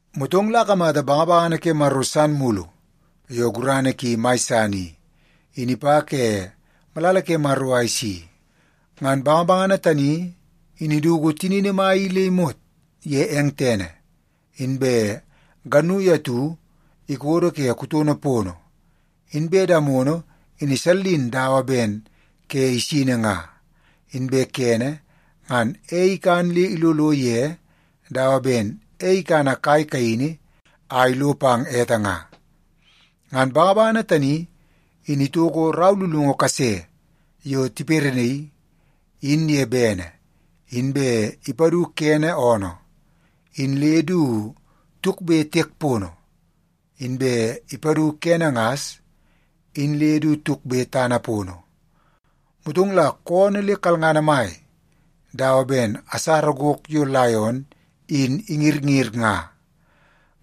Motong la akamata bangabangana ke Maro san mulu yo gurana ki mai san i, in ipa ke malala ke Maro a isi. Ngan bangabangana tani in iduku tinini mai i le imot ye eng tene, inbe gannui atu ikodo ke kutono pono. Inbe damono in isallin dawa ben ke isini nga. Inbe kene, ngan ei ikan le ilolo ye dawa ben ei ikana kai kaini a ilo pang ete nga. Ngan bangabangana tani in itoko rau lulungu kase yo tiperenaii in ye bene, inbe ipadu kene oonoo in le du tukbe tiek pono, inbe ipadu kene ngas in le du tukbe tana pono. Motong la koonoo le kalngana mai dawa ben asara gok yo laion in ingirngir nga.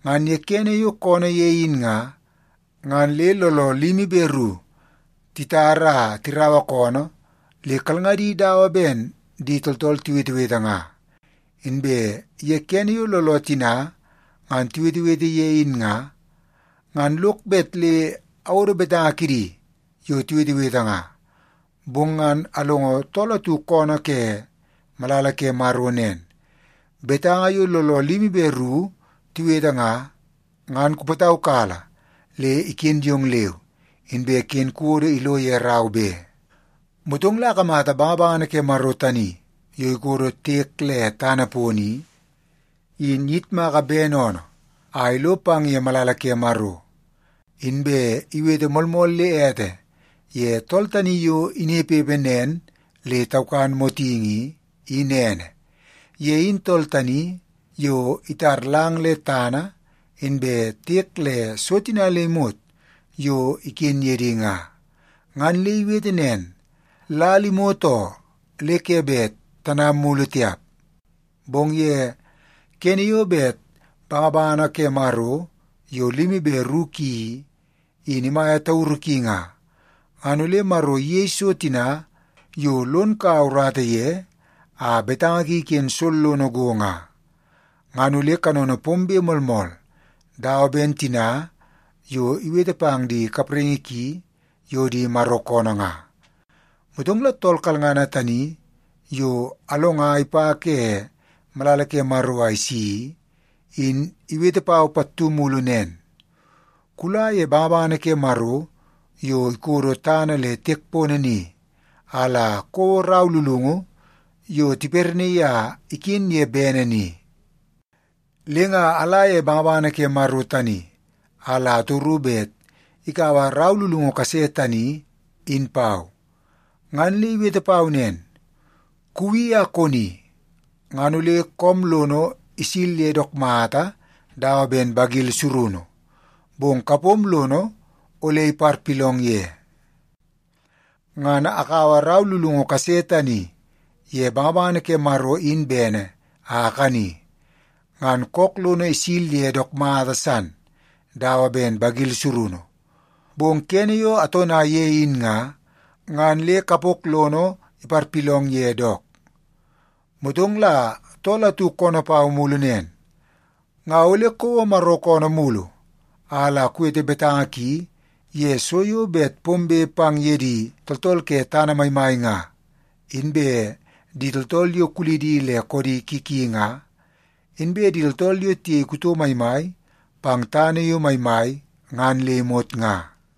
Ngan ye kene yo koonoo ye in nga, ngan le looloo limi be ru titara a tiraua koonoo le kalngadi dawa ben di tooltool tiwetewete nga. Inbe ye kene yo looloo tina ngan tiwetewete ye in nga, ngan lok bet le awodo betanga kidi yo tiwetewete nga. Bong ngan alongo tool atu koonoo ke malala ke Maro nen, “Betanga yo looloo limi be ru tiwete nga, ngan kupataukala le iken yong leu, inbe ken kuwodo ilo ye rau be.” Motong la akamata bangabangana ke Maro tani yo ikodo tiek le tana pono i, in iyitmaka bene oonoo a ilo pang ye malala ke Maro. Inbe iwete moolmool le ete ye tool tani yo inepepe nen le taukan motingi i, in ene. Ye in tool tani yo itar lang le tana inbe tiek le so tina le imot yo iken ye di nga. Ngan le iwete nen, “Lal imot oo, le ke bet tanam mulu tiap! Bong ye kene yo bet bangabangana ke Maro yo limi be ru ki i, in imaia tauru ki nga, ngan ole Maro iyei so tina yo lon kaua urata ye a betanga ki iken sollono go nga. Ngan ole kanono pombe moolmool dawa ben tina yo iwete pang di kapraingi ki yo di Maro koonoo nga.” Motong la tool kalngana tani yo alonga ipa ke malala ke Maro a isi i, in iwete pau pattu mulu nen, “Kula ye bangabangana ke Maro yo ikodo tana le tiek pono ni a la kouo rau lulungu yo tiperenaii a iken ye bene ni.” Le nga ala ye bangabangana ke Maro tani a la atoru bet ikaua rau lulungu kase tani in pau. Ngan le iwete pau nen, “Kuwi a koni, ngan ole koom lono isil ye dook mata dawa ben bagil surunu, bong kapom lono ole iparpilong ye.” Ngan akaua rau lulungu kase tani ye bangabangana ke Maro in bene a akani, ngan kook lono isil ye dook mata san dawa ben bagil surunu. Bong kene yo atona ye in nga, ngan le kapok lono iparpilong ye dook. Motong la tool atu koonoo pau mulu nen, “Nga ole kouo Maro koonoo mulu a la kuwete betanga ki ye so yo bet pombe pang ye di tooltool ke tana maimai nga, inbe di tooltool yo kulidi le koodi ki ki nga, inbe di tooltool yo tiyei kuto maimai pang tana yo maimai ngan le imot nga.”